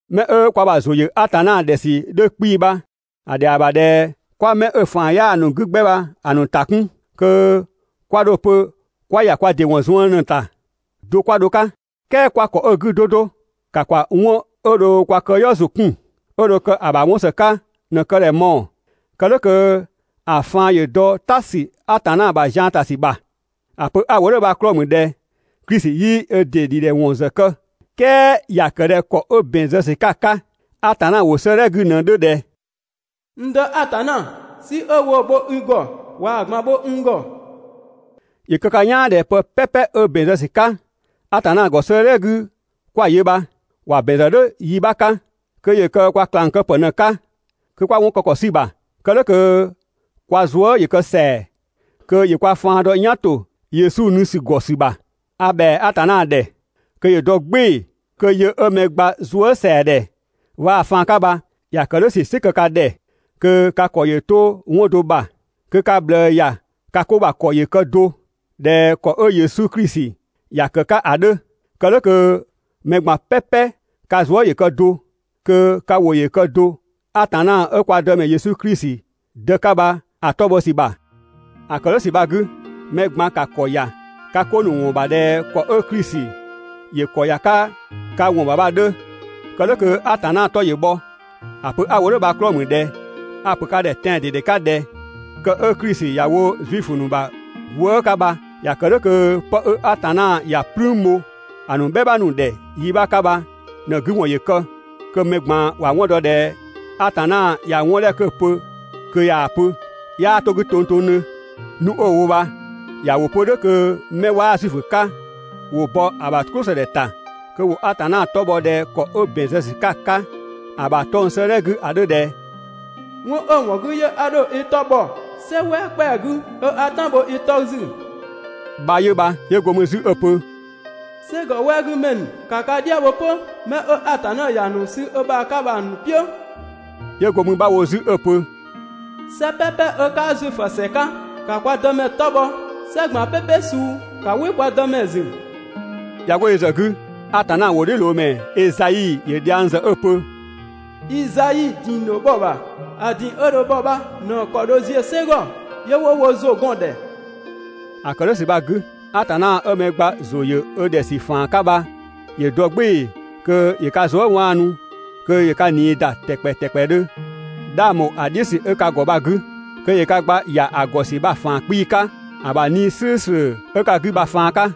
'Mɛ 'ö kwa ‑bha ‑zʋ ‑yö Atanna ‑dhɛ ‑sü 'dhö 'kpii‑ bha‑ ‑dhɛa ‑bha ꞊dhɛ 'kwa 'mɛ 'ö‑ ‑faan 'yaa‑ ‑nu 'gü 'gbɛ bha‑ ‑nu ‑ta 'kun, kö 'kwa 'dho‑ pö 'kwa ‑ya kwa ‑dɩ ‑wɔn zuën ꞊në‑ ‑ta do 'kwa dho‑ 'ka. "Kɛɛ 'kwa ‑kɔ 'ö‑ 'gü 'do 'do, ‑ka ‑kwa 'wɔn 'ö dho kwa këyɔɔ ‑zʋ 'kun, 'ö dho kë‑ ‑bha 'wɔn ‑së 'ka ꞊në‑ kë ‑dhɛ mɔɔ‑, kë "dhʋ̈ kö ‑a faan‑ ‑yö dɔ "ta ‑sü Atanna ‑bha zian ‑ta ‑sü ‑bha. ‑A pö 'a‑ wo "dhʋ̈ bha‑ 'klɔɔ‑ ‑mü ꞊dhɛ Klisi 'yii ö ‑dɩ ‑dhidhɛwɔn ‑zë kë. "Kɛɛ ‑ya ‑kë ꞊dhɛ ‑kɔ 'ö ‑bɛn zë ‑sü 'ka 'ka Atanna ‑wʋ 'sëëdhɛ 'gü ꞊në‑ 'dhö ꞊dhɛ: «N Dë Atanna, "si 'ö woo‑ bho i ‑gɔ, ꞊waa‑ ꞊gban bho n ‑gɔ.» ‑Yö kë ka "yaan ꞊dhɛ pë "pɛpɛ 'ö ‑bɛn zë ‑sü 'ka Atanna ‑gɔ 'sëëdhɛ 'gü 'kwa‑ yö bha, ‑wa ‑bɛn ‑zë "dhʋ̈ yi 'bha 'ka kö ‑yö kë kwa ꞊klang kë ‑pë ꞊në‑ 'ka kö 'kwa 'wɔn kë ‑kɔ 'sü‑ ‑bha. Kë "dhʋ̈ kö kwa zuë" ‑yö kë ‑sɛa, kö ‑yö kwa faan dɔ "yan ‑to Yesu nu ‑sü ‑gɔ ‑sü ‑bha. A ‑bhɛa Atanna ‑dhɛ kö ‑yö dɔ "gbɩɩ‑ kö yö 'ö mɛ gba zuësɛadhɛ waa‑ faan 'ka bha, ‑ya ‑kë "dhʋ̈ ‑sü "sɩ kë ka ‑dhɛ kö ka ‑kɔ ‑yö 'to 'wɔn do ‑bha, kö ka ꞊bhlëë ‑ya ka 'ko ‑bha ‑kɔ ‑yö kë do ꞊dhɛ ‑kɔ 'ö Yesu Klisi ‑ya ‑kë 'ka ‑a 'dhö. Kë "dhʋ̈ kö mɛ ꞊gban "pɛpɛ ka zuë" ‑yö kë do, kö ka ‑wʋ ‑yö kë do Atanna 'ö kwa Dëmɛ Yesu Klisi Dë 'ka bha‑ 'tɔ bhɔ ‑sü ‑bha. ‑A ‑kë "dhʋ̈ ‑sü bha‑ 'gü, mɛ ꞊gban ‑ka ‑kɔ ‑ya ka 'ko ‑nu ‑wɔn ‑bha ꞊dhɛ ‑kɔ 'ö Klisi ‑yö ‑kɔ ‑ya 'ka ka ‑wɔn ‑bha bha‑ 'dhö, kë "dhʋ̈ kö Atanna 'tɔ ‑yö bhɔ. ‑A pö 'a wo "dhʋ̈ bha‑ 'klɔɔ‑ ‑mü ꞊dhɛ: A‑ ‑pö ka ‑dhɛ tɛan‑ ꞊dede 'ka ꞊dhɛ kë 'ö Klisi ‑ya wo Zuifö ‑nu ‑bha gwëë" 'ka bha, ‑ya ‑kë "dhʋ̈ kö 'pë 'ö Atanna ‑ya "plüün bho ‑a ‑nu "bhɛma ‑nu ‑dhɛ yi 'bha 'ka bha ꞊në‑ 'gü ‑wɔn ‑yö kë, kö mɛ ꞊gban ‑wa 'wɔn dɔ ꞊dhɛ Atanna ꞊ya 'wɔn 'dhɛ 'kö‑ pö kö ꞊yaa‑ pö, 'yaa 'to‑ 'gü tongtongdhö. Nu 'ö‑ wo bha ‑ya ‑wo 'pö "dhʋ̈ kö 'mɛ 'waa Zuifö 'ka ‑wo bɔ ‑a ‑bha "klʋsëdhɛ ‑ta kö ‑wo Atanna 'tɔ bhɔ ꞊dhɛ ‑kɔ 'ö ‑bɛn zë ‑sü 'ka ‑a 'ka ‑a ‑bha 'tɔng‑ 'sëëdhɛ 'gü ‑a 'dhö ꞊dhɛ: «'Wɔn 'ö‑ ‑wɔn 'gü 'yö 'a dho i 'tɔ bhɔ "sɛ "wɛɛ ‑kpɛa 'gü, 'ö 'a "tan bho i 'tɔ ‑zü» bha 'yö bha. 'Yö go mü 'zü 'ö‑ pö: «"Sɛgɔ "wɛɛ 'gü ‑mɛ ‑nu, ‑ka ka "dhia bho 'pö 'mɛ 'ö Atanna ‑ya ‑nu sü ö ‑bha 'ka bha‑ ‑nu "piʋ̈!» 'Yö go mü 'bha wo 'zü 'ö‑ pö: «"Sɛ "pɛpɛ 'ö 'kaa Zuifö ‑sɛ 'ka, ‑ka kwa Dëmɛ 'tɔ bhɔ, "sɛ ꞊gban "pɛpɛ suu, ‑ka "wɩ kwa Dëmɛ ‑zü!» ꞊Ya 'go yö ‑zë 'gü 'zü, Atanna ‑wʋdhiʋ̈loomɛ Ezai ‑yö dhiang ‑zë 'ö‑ pö: «Izai ‑ding dho bhɔ‑ ‑bha, ‑a ‑ding 'ö dho bhɔ bha ꞊në‑ ‑kɔ dho ziö "sɛ ‑gɔ, 'yö 'wo wo ‑zʋ gɔn‑ ‑dhɛ.» ‑A ‑kë "dhʋ̈ ‑sü bha‑ 'gü, Atanna 'ö mɛ gba ‑zʋ ‑yö ö ‑dhɛ ‑faan 'ka bha ‑yö dɔ "gbɩɩ‑ kö ‑yö ka zuë" ‑da kö ‑yö ka zuë" ꞊nii 'waanu ‑tɛkpɛ ‑tɛkpɛdhö, 'dhang ‑bho ‑a "dhiʋ̈ ‑sü 'ö ka ‑gɔ bha‑ 'gü. kö ‑yö ka gba ‑ya ‑a ‑gɔ ‑sü bha‑ ‑faan 'kpii‑ 'ka ‑a ‑bha 'Nii‑ "slʋ̈ʋ̈slʋ̈ 'ö ka 'gü bha‑ ‑faan 'ka.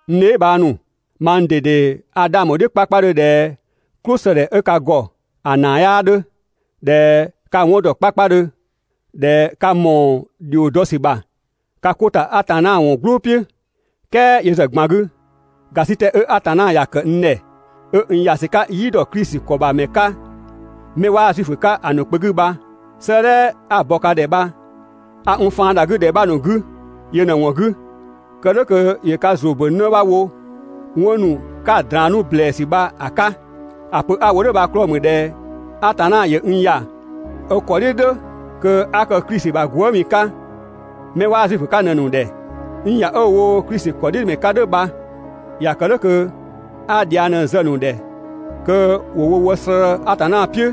N dheebhang ‑nu, mang ꞊dede a 'dhang bho‑ "dhiʋ̈ 'kpakpadhö ꞊dhɛ "klʋsëdhɛ 'ö ka ‑gɔ ‑a ‑naa 'yaa 'dhö, ꞊dhɛ ka 'wɔn ‑dɔ 'kpakpadhö, ꞊dhɛ ka ‑mɔɔ ‑dhio dɔ ‑sü ‑bha ka 'ko ‑ta Atanna ‑wɔn "gblʋʋ "piʋ̈. "Kɛɛ yö ‑zë ꞊gban 'gü, ‑gasitɛ 'ö Atanna ‑ya ‑kë n ‑dhɛ 'ö n ‑ya ‑sü 'ka "yi ‑dɔ Klisi ‑kɔ ‑bha ‑mɛ 'ka 'mɛ 'waa Zuifö 'ka‑ ‑nu kpö 'gü bha, 'sëëdhɛ 'a‑ bɔ ka ‑dhɛ bha, a n faan ‑da 'gü ‑dhɛ 'bha ‑nu 'gü yö ꞊në‑ ‑wɔn 'gü, kë "dhʋ̈ kö ‑yö ka ‑zʋ ‑bö 'në 'bha wo 'wɔn 'nu 'ka‑ draan‑ 'nu ‑blɛɛsü bha‑ 'ka. ‑A pö 'a‑ wo "dhʋ̈ bha‑ 'klɔɔ‑ ‑mü ꞊dhɛ Atanna ‑yö n ‑ya ö ‑kɔ "dhiʋ̈ "dhʋ̈ kö 'a kë Klisi ‑bha gwëëmi 'ka 'mɛ 'waa Zuifö 'ka ꞊në‑ ‑nu ‑dhɛ. N ‑ya 'ö‑ wo Klisi ‑kɔdhiʋ̈dɔmɛ 'ka "dhʋ̈ bha, ‑ya ‑kë "dhʋ̈ kö 'a dhiang ꞊në zë‑ ‑nu ‑dhɛ kö ‑wo wo wë slëë‑ Atanna "piʋ̈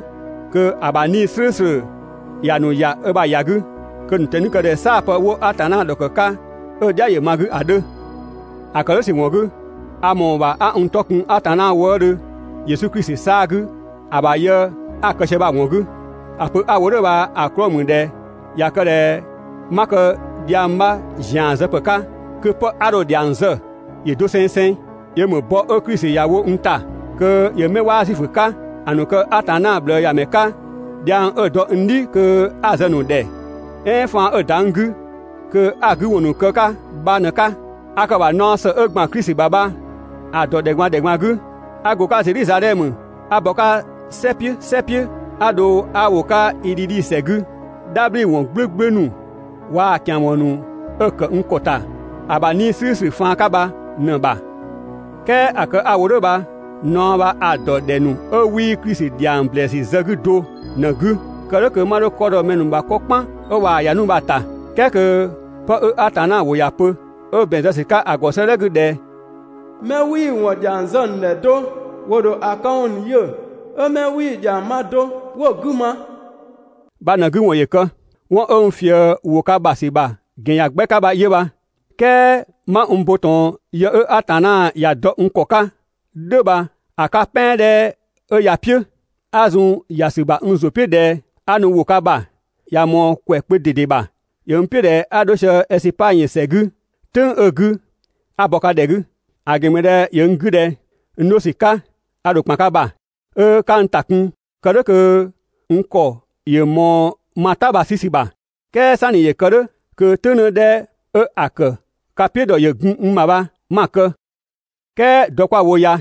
kö ‑a ‑bha 'Nii‑ "slʋ̈ʋ̈slʋ̈ ‑ya ‑nu ‑ya ö ‑bha ‑ya 'gü, kö‑ ‑nu ꞊tɛni‑ kë ꞊dhɛ "saa‑ ‑pë 'wo Atanna ‑dhɔkë 'ka 'ö‑ "dhia ‑yö ma‑ 'gü ‑a 'dhö. ‑A ‑kë "dhʋ̈ ‑sü ‑wɔn 'gü, a ‑mɔɔ ‑bha 'a n ‑tɔ kun Atanna wëëdhö Yesu Klisi 'saa‑ 'gü ‑a ‑bha yë 'a‑ kë sië bha‑ ‑wɔn 'gü. ‑A pö 'a‑ wo "dhʋ̈ bha‑ 'klɔɔ‑ ‑mü ꞊dhɛ ꞊ya kë ꞊dhɛ 'ma kë dhiang 'bha ‑zian zë ‑pë 'ka, kö 'pë 'a dho‑ ‑dhiang zë ‑yö dosengseng, yö ‑mü bɔ 'ö Klisi ‑ya wo n ‑ta kö ‑yö 'mɛ 'waa Zuifö 'ka‑ ‑nu kë Atanna ꞊bhlëëyamɛ 'ka, dhiang 'ö‑ dɔ n "dhi kö 'a‑ zë‑ ‑nu ‑dhɛ, "ɛɛn faan 'ö‑ ‑da n 'gü kö 'a‑ 'gü ‑wɔn ‑nu kë‑ 'ka bha ꞊në‑ 'ka. A kë‑ ‑bha naɔ ‑së 'ö ‑gban Klisi ‑bha bha‑ ‑dɔ ‑dhɛ ꞊gban ‑dhɛ ꞊gban 'gü, 'a go‑ 'ka Zedhizadhɛmö 'a bɔ‑ 'ka "sɛ "piʋ̈ "sɛ "piʋ̈ 'a dho 'a ‑wo 'ka Idhidhi ‑sɛ 'gü, "dhabhliwɔn "gblʋ̈gblʋ̈ ‑nu waa‑ ‑kian ‑wɔn ‑nu 'ö‑ ‑kë n ‑kɔ ‑ta ‑a ‑bha 'Nii‑ "slʋ̈ʋ̈slʋ̈ faan 'ka bha ꞊në‑ ‑bha. "Kɛɛ ‑a kë 'a‑ wo "dhʋ̈ bha, naɔ bha a‑ ‑dɔ ‑dhɛ ‑nu 'ö 'wii Klisi ‑dhiang ‑blɛɛsü zë‑ 'gü do ꞊në‑ 'gü. Kë "dhʋ̈ kö 'ma 'dho 'kɔ dɔ mɛ ‑nu ‑bha 'kɔ "kpan 'ö ꞊waa‑ ‑ya 'nu bha‑ ‑ta. "Kɛɛ kö pë 'ö Atanna ‑wʋ ‑ya pö, ö ‑bɛn zë ‑sü 'ka‑ ‑gɔ 'sëëdhɛ 'gü ꞊dhɛ: «Mɛ 'wii‑ ‑wɔn ‑dhiang zë‑ ‑nu ‑dhɛ do, ‑wo ‑dho ‑a këwɔn ‑nu yö, 'ö mɛ 'wii‑ ‑dhiang ma do, 'wo‑ 'gü ma» bha‑ ꞊në‑ 'gü ‑wɔn ‑yö kë. 'Wɔn 'ö n ꞊fië ‑wo ka ‑bha ‑sü ‑bha ‑gɛn ‑yan 'gbɛ 'ka bha 'yö bha. "Kɛɛ 'ma n bo ꞊tɔn yë 'ö Atanna ‑ya dɔ n ‑kɔ 'ka "dhʋ̈ bha‑ 'ka "pɛan 'dhɛ 'ö ya‑ "piʋ̈, 'a zun‑ ‑ya ‑sü ‑bha n ‑zʋ "piʋ̈ ꞊dhɛ 'a nu ‑wo ka ‑bha, ꞊ya ꞊mɔɔ ‑kwɛ kpö ꞊dede ‑bha. ‑Yö n "piʋ̈ ꞊dhɛ 'a 'dho sië Ɛsipangyö ‑sɛ 'gü "tʋ̈ng 'ö‑ 'gü 'a bɔ ka ‑dhɛ 'gü. ‑A ‑gɛn ‑mü ꞊dhɛ ‑yö n 'gü ꞊dhɛ n 'dho ‑sü 'ka a ‑dho ‑kpan ka ‑bha, 'ö 'ka n ‑ta kun kë "dhʋ̈ kö n ‑kɔ ‑yö ꞊mɔɔ ma "ta bha‑ 'sü ‑sü ‑bha. "Kɛɛ "sanni ‑yö kë "dhʋ̈ kö "tʋ̈ng 'në 'dhɛ 'ö‑ ‑kë ka "piʋ̈ ‑dhɔ ‑yö gun n ‑bha bha 'ma‑ kë. "Kɛɛ dɔ 'kwa‑ wo ya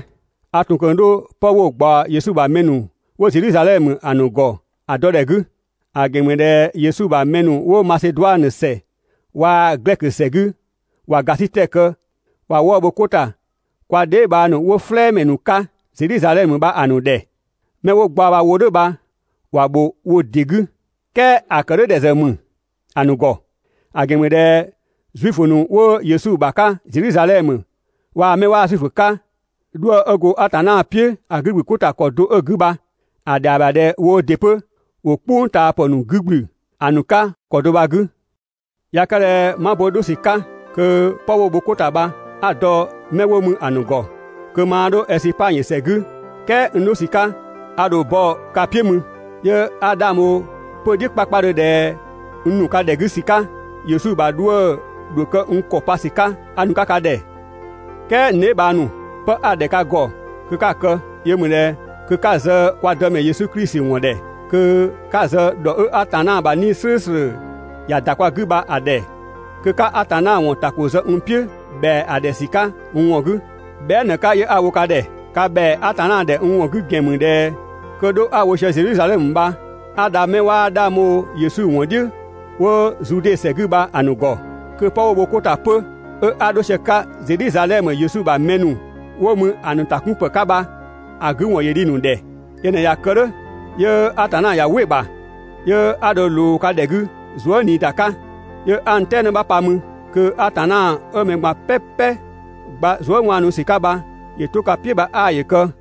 a ‑tun ꞊kö 'dho 'pë 'wo‑ ꞊gbaɔ Yesu ‑bha mɛ ‑nu 'wo Zedhizadhɛmö ‑a ‑nu ‑gɔ ‑a dɔ ‑dhɛ 'gü. ‑A ‑gɛn ‑mü ꞊dhɛ Yesu ‑bha mɛ ‑nu 'wo Maseduanö ‑sɛ waa‑ Glɛkö ‑sɛ 'gü ꞊wa ‑gasitɛ kë ꞊wa 'wëë‑ bho 'ko ‑ta kwa dheebhang ‑nu 'wo "flɛɛmɛ ‑nu 'ka Zedhizadhɛmö bha‑ ‑nu ‑dhɛ. Mɛ 'wo gbaɔ bha‑ wo "dhʋ̈ bha ‑wa ‑bho wo ‑dɩ 'gü, "kɛɛ ‑a ‑kë "dhʋ̈ ‑dhɛ ‑zë ‑mü ‑a ‑nu ‑gɔ, ‑a ‑gɛn ‑mü ꞊dhɛ Zuifö ‑nu 'wo Yesu ‑bha 'ka Zedhizadhɛmö waa‑ 'mɛ 'waa Zuifö 'ka 'wo 'dhuë‑ 'ö go Atanna "piʋ̈ ‑a 'gü ‑gblü 'ko ‑ta ‑kɔ do 'ö‑ 'gü bha, ‑a ‑dhɛa ‑bha ꞊dhɛ woo ‑dɩ 'pö ‑wo "kpʋngtaapë ‑nu 'gü ‑gblü ‑a ‑nu 'ka ‑kɔ do bha‑ 'gü. ꞊Ya kë ꞊dhɛ 'ma bo 'dho ‑sü 'ka kö 'pë 'wo‑ bho ko ‑ta bha, 'a‑ dɔ 'mɛ 'wo ‑mü ‑a ‑nu ‑gɔ, kö maa 'dho Ɛsipangyö ‑sɛ 'gü, "kɛɛ n 'dho ‑sü 'ka, a ‑dho bɔ ka "piʋ̈ mü. 'Yö 'a 'dhang bho 'pö‑ "dhiʋ̈ 'kpakpadhö ꞊dhɛ n ‑nu 'ka ‑dhɛ 'gü ‑sü 'ka, Yesu ‑bha 'dhuë‑ ‑dho kë n ‑kɔ pa ‑sü 'ka 'a nu‑ 'ka ka ‑dhɛ. "Kɛɛ n dheebhang ‑nu, 'pë 'a‑ ‑dhɛ ka ‑gɔ kö 'ka‑ kë yö ‑mü ꞊dhɛ kö 'ka zë kwa Dëmɛ Yesu Klisi ‑wɔn ‑dhɛ, kö 'ka zë ‑dhɔ 'ö Atanna ‑bha 'Nii‑ "slʋ̈ʋ̈slʋ̈ ‑ya ‑da kwa 'gü bha‑ ‑dhɛ, kö 'ka Atanna ‑wɔn ‑ta ‑ko zë n "piʋ̈ ‑bhɛa ‑dhɛ ‑sü 'ka n ‑wɔn 'gü, bhɛa" ꞊në‑ 'ka 'yö 'a‑ wo ka ‑dhɛ. Ka ‑bhɛa Atanna ‑dhɛ n ‑wɔn 'gü ‑gɛn ‑mü ꞊dhɛ kö 'dho 'a‑ wo sië Zedhizadhɛmö bha 'a dha mɛ 'waa 'dhang bho Yesu ‑wɔn "dhiʋ̈ 'wo Zude ‑sɛ 'gü bha‑ ‑nu ‑gɔ, kö 'pë 'wo‑ bho 'ko ‑ta 'pö 'ö 'a dho sië‑ 'ka Zedhizadhɛmö Yesu ‑bha mɛ ‑nu 'wo mü ‑a ‑nu ‑ta 'kun ‑pë 'ka bha‑ 'gü ‑wɔn ‑yö dhi‑ ‑nu ‑dhɛ. Yö ꞊në ꞊ya kë "dhʋ̈, 'yö Atanna ꞊ya "wɩ‑ ‑bha, 'yö 'a dho ꞊loo ka ‑dhɛ 'gü zuë" ꞊nii ‑da 'ka, 'yö 'a n "tɛɛ 'në 'bha pa mü. Kö Atanna 'ö mɛ ꞊gban "pɛpɛ gba zuëwaanusü 'ka bha, ‑yö 'to ka "piʋ̈ bha 'aa ‑yö kë.